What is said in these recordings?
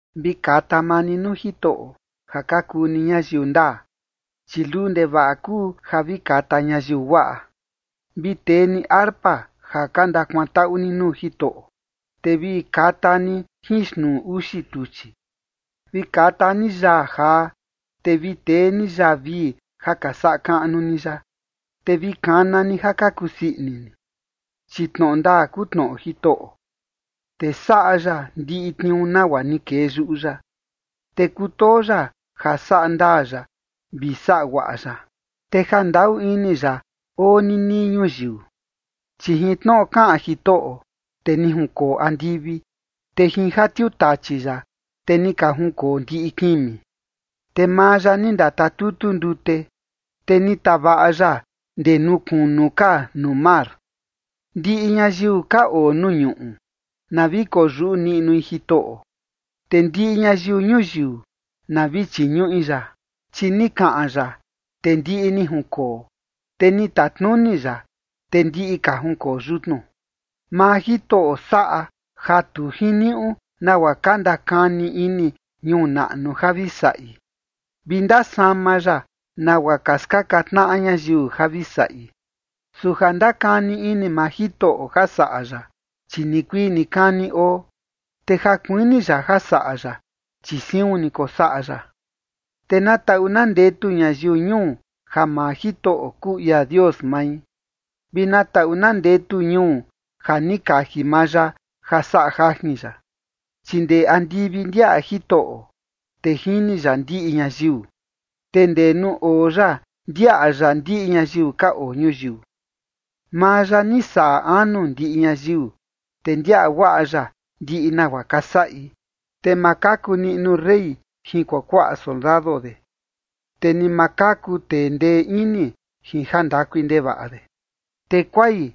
Vi kata maa ni nuu Jitoꞌo ja ka kuu ni ñayiu ndaa, chi luu ndevaꞌa kuu ja vi kata ñayiu guaꞌa. Vi tee ni arpa ja ka ndakuantaꞌu ni nuu Jitoꞌo, te vi kata ni jin xtnuu uxi tuchi. Vi kata ni yaa jaa, te vi tee ni yaa vii ja ka saꞌa kaꞌnu ni ya, te vi kana ni ja ka kusii ini ni. Chi tnoꞌo ndaa kuu tnoꞌo Jitoꞌo, te saꞌa ya ndiꞌi tniuu nagua ni kee yuꞌu ya. Te kutoo ya ja saꞌa ndaa ya vi saꞌa guaꞌa ya, te jandaꞌu ini ya oo ninii ñuyiu. Chi jin tnoꞌo kaꞌan Jitoꞌo, te ni junkoo andivi, te jin ja tiutachi ya, te ni ka junkoo ndiꞌi kimi. Te maa ya ni ndatatutu ndute, te ni tavaꞌa ya ndee nuu kunu ka nuu mar. Ndiꞌi ñayiu ka oo nuu ñuꞌu na vi koyuꞌu niꞌnui Jitoꞌo, te ndiꞌi ñayiu ñuyiu na vi chiñuꞌi ya. Chi ni kaꞌan ya, te ndiꞌi ni junkoo, te ni tatnuni ya, te ndiꞌi ka junkoo yutnu. Maa Jitoꞌo saꞌa ja tu jiniuꞌu nagua ka ndakani ini ñuu naꞌnu ja vi saꞌi, vi ndasama ya nagua ka skaka tnaꞌa ñayiu ja vi saꞌi. Su ja ndakani ini maa Jitoꞌo ja saꞌa ya, chi nikuii nikani oo, te ja kuini ya ja saꞌa ya, chi siun ni kosaꞌa ya. Te na taꞌu na ndetu ñayiu ñuu ja maa Jitoꞌo kuu ia Dios mai, vi na taꞌu na ndetu ñuu ja ni kaji maa ya ja saꞌa jajin ya. Chi ndee andivi ndiaꞌa Jitoꞌo, te jini ya ndiꞌi ñayiu. Te ndee nuu oo ya ndiaꞌa ya ndiꞌi ñayiu ka oo ñuyiu. Maa ya ni saꞌa anu ndiꞌi ñayiu, te ndiaꞌa guaꞌa ya ndiꞌi nagua ka saꞌi. Te ma kaku niꞌnu rey jin kuakuaꞌa soldado de, te ni ma kaku tee ndee ini jin jandakui ndevaꞌa de. Te kuai,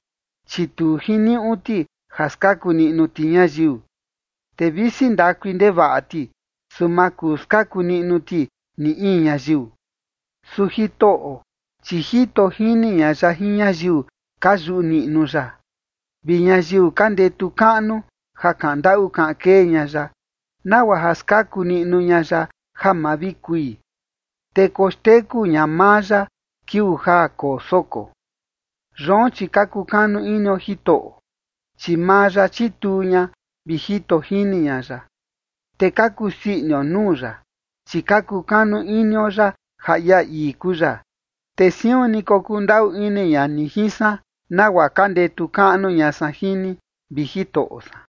chi tu jiniuꞌu ti ja skaku niꞌnu ti ñayiu, te visi ndakui ndevaꞌa ti, su ma kuu skaku niꞌnu ti ni in ñayiu. Su Jitoꞌo, chi jito jini ña ya jin ñayiu ka yuꞌu niꞌnu ya vi ñayiu ka ndetu kaꞌnu ja kaꞌan ndaꞌu kaꞌan kee ña ya, nagua ja skaku niꞌnu ña ya ja ma vi kui, te koxteku ña maa ya kiuu ja koo soko. Yoon, chi ka kukanu inio Jitoꞌo, chi maa ya chituu ña vi jito jini ña ya. Te ka kusii inio nuu ya, chi ka kukanu inio ya ja ia ii kuu ya. Te siun ni kokundaꞌu ini ña ni jin san, nagua ka ndetu kaꞌnu ña san jin ni, vi Jitoꞌo san.